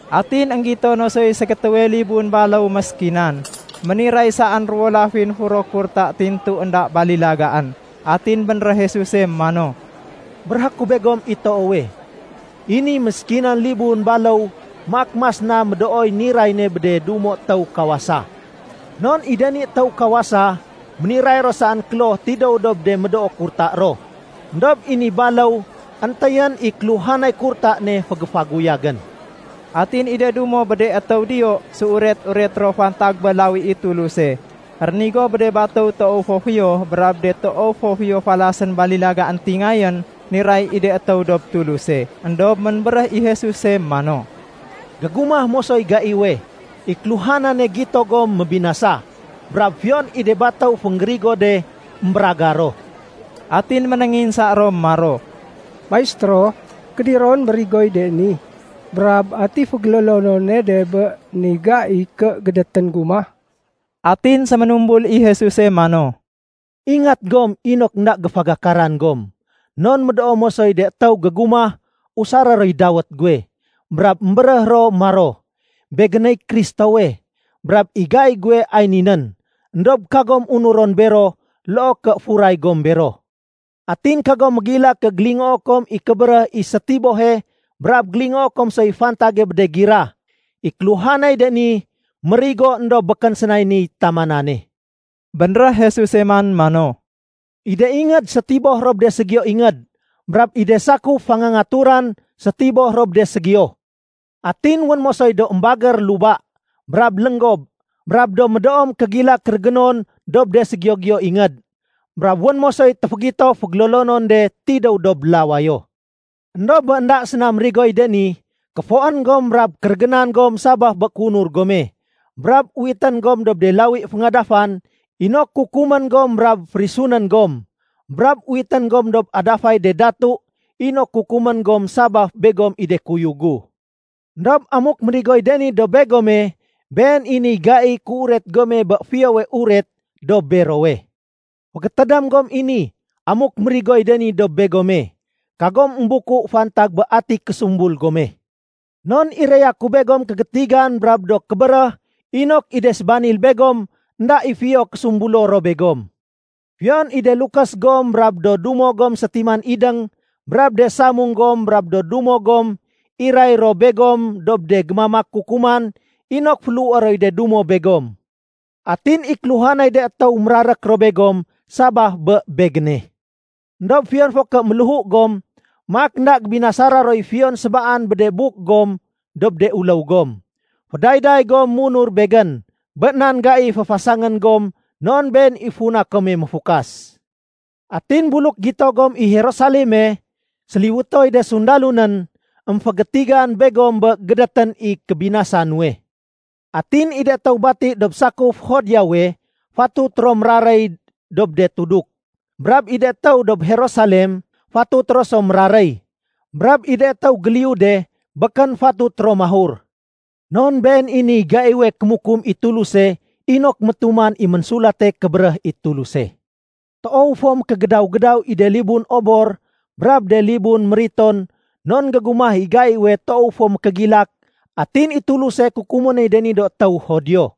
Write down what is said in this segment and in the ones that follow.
Atin énggito no soy ségétéwe libun baléw méskinan, méniray saén ruwo lafin furo kurta tintu énda balilagaén. Atin bénréh Jesuse mano, “Béréhé ku begom i toowe, i ni méskinan libun baléw maak mas na médooy niray ne bé de dumo étéw kawasa. Non i de ni étéw kawasa, méniray ro saén kloh tidéw dob de médoo kurta ro. Endob i ni baléw éntéyén i kéluhanay kurta ne fégéfaguyagén.” Atin i de dumo bé de étéw diyo séuret-uret ro fantag bé lawi i Tuluse rénigo bé de batéw toow fo fiyo brab de toow fo fiyo falasén balilaga éntingayén niray i de étéw dob Tuluse. Endob ménbéréh i Jesuse mano, “Gégumah mosoy gaiwe, i kéluhanane gito gom mébinasa. Brab fiyon i de batéw fénggérigo de émbéragar ro.” Atin ménénginsa ro maro, “Maistéro, kédiron mérigoy de ni? Brab ati fégélolonone de bé ni gai ké gédétén gumah?” Atin séménumbul i Jesuse mano, “Ingat gom inok énda géfagakaran gom. Non médoo mosoy de étéw gégumah usaré roy dawét guwe, brab émbéréh ro maro, ‘Begéney Kristowe, brab i gai guwe ay ni nén.’ Endob kagom unuron bero loo ké furay gom bero. Atin kagom mégilak ké gélingoo kom i kébéréh i sétibohe brab gélingoo kom soy fantage bé de gira. I kéluhanay de ni mérigo éndob békén sénay niy tamanane.” Bénréh Jesuse man mano, “I de ingéd sétiboh ro bé de ségiyo ingéd. Brab i de sakuf fangangaturan sétiboh ro bé de ségiyo. Atin wén mosoy do émbagér luba, brab lénggob, brab do médoo mékégilak kérégénon dob de ségiyo-giyo ingéd. Brab wén mosoy téfégito fégélolonon de tidéw dob lawayo. Endob bé énda séna mérigoy de ni, kéfoén gom brab kérégénan gom sabaf bé kéunur gome. Brab uwitén gom dob de lawi féngadafan inok kukumén gom brab férisunén gom. Brab uwitén gom dob adafay de datu inok kukumén gom sabaf begom i do kuyug gu. Endob amuk mérigoy de ni dob begome, been i niy gaiy kéuret gome bé Fiyowe Uret dob berowe. Fégétédém gom i ni, amuk mérigoy de ni dob begome, kagom émbuku fantag bé ati késumbul gome. Non iraya ku begom kégétigan brab do kébéréh inok i de sébanil begom énda i fiyo késumbulo ro begom. Fiyon i de lukés gom brab do dumo gom sétiman idéng brab de samung gom brab do dumo gom, iray ro begom dob de gémamak kukuman inok féléhué roy de dumo begom. Atin i kéluhanay de étéw mérarék ro begom sabaf bé Begéne. Endob fiyon fo ké méléhu gom, maak énda gébinasana roy fiyon sébaan buk dob de uléw gom. Fédayday gom munur Begén bé nan gai féfasangén gom non been i funa kome méfukas. “Atin buluk gito gom i Jerusaleme séliwétoy de sundalo nén, émfégétigan begom bé gédétén i kébinasa nuwe. Atin i de étéw bati dob sakuf Judeawe fatut ro méraréy dob de tuduk. Brab de étéw dob Jerusalem fatut ro so méraréy. Brab i de étéw géliyu de, békén fatut ro mahur. Non been i niy gaiwe kémukum i Tuluse inok métuman i Ménsulate Kébéréh i Tuluse. Toow fo mékégédaw-gédaw i de libun obor brab de libun mériton non gégumah i gaiwe toow fo mékégilak atin i Tuluse kukumé noy de ni do étéw Judio.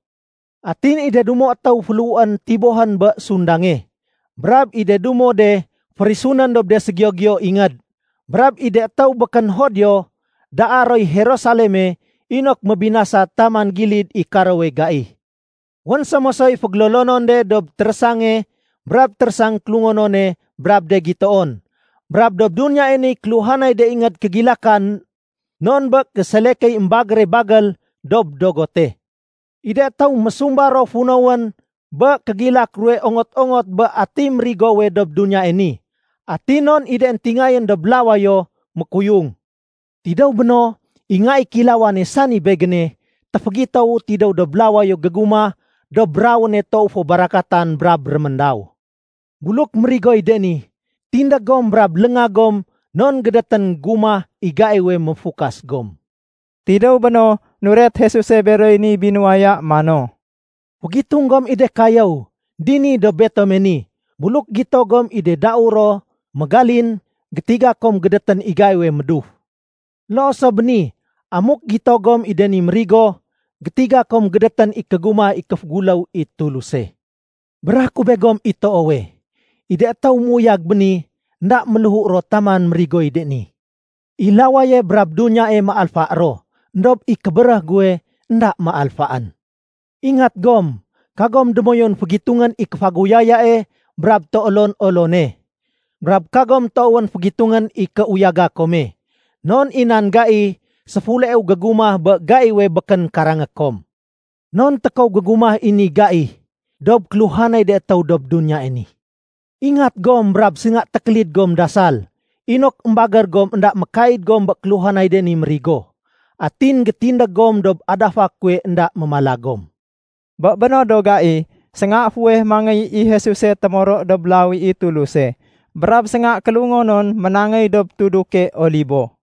Atin i de dumo étéw féléhuén tibohén bé sundange, brab i de dumo de férisunén dob de ségiyo-giyo ingéd. Brab i de étéw békén Judio daa roy Jerusaleme inok mébinasa taman gilid i karowe gai. “Wén so mosoy fégélolonon de dob térésange brab térésang kélungonone brab de gitoon, brab dob duniyae niy kéluhanay de ingéd kégilakan non bé késelekéy émbagére bagél dob dogote. I de étéw mésumba ro funowén bé kégilak ruwe ongot-ongot bé ati mérigowe dob duniyae ni, atin non i de éntingayén dob lawayo mékuyung. Tidéw béno, i Nga i Kéilawane, sani Begéne, téfégitowu tidéw dob lawayo gégumah dob rawéne toow fo barakatan brab réméndaw. Buluk mérigoy de ni, tindég gom brab léngag gom non gédétén gumah i gaiwe méfukas gom.” Tidéw béno, nuret Jesuse beroy ni binuwaya mano, “Fégitung gom i de kayéw. Dini dob betome ni, buluk gito gom i de dau ro mégalin, gétiga kom gédétén i gaiwe méduf. Loo so bé ni amuk gito gom i de ni mérigo, gétiga kom gédétén i kégumah i kéféguléw i Tuluse. “Béréhé ku begom i toowe, i de étéw méuyag béni, énda méléhu ro taman mérigoy de ni. I lawaye brab duniyae méalfa ro, éndob i kébéréh guwe énda méalfaén. “Ingat gom. Kagom démoyun fégitungén i kéfaguyayae brab téolon-olone, brab kagom toowén fégitungén i kéuyaga kome, non i nan gai séfuleu gégumah bé gaiwe békén karangé kom. Non tékow gégumah i ni gai dob kéluhanay de étéw dob duniyae ni. Ingat gom brab sénga tékélid gom dasal inok émbagér gom énda mékaid gom bé kéluhanay de ni mérigo. Atin gétindég gom dob adafa kuwe énda mémala gom.” Bé béno do gai, sénga fuweh mangéy i Jesuse témoro dob lawi i Tuluse, brab sénga kélungonon ménangéy dob tuduke Olibo.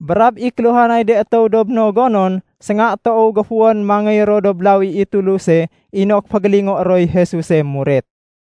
Brab i kéluhanay de étéw dob no gonon, sénga toow géfuwén mangéy ro dob lawi i Tuluse inok fégélingoé roy Jesuse muret.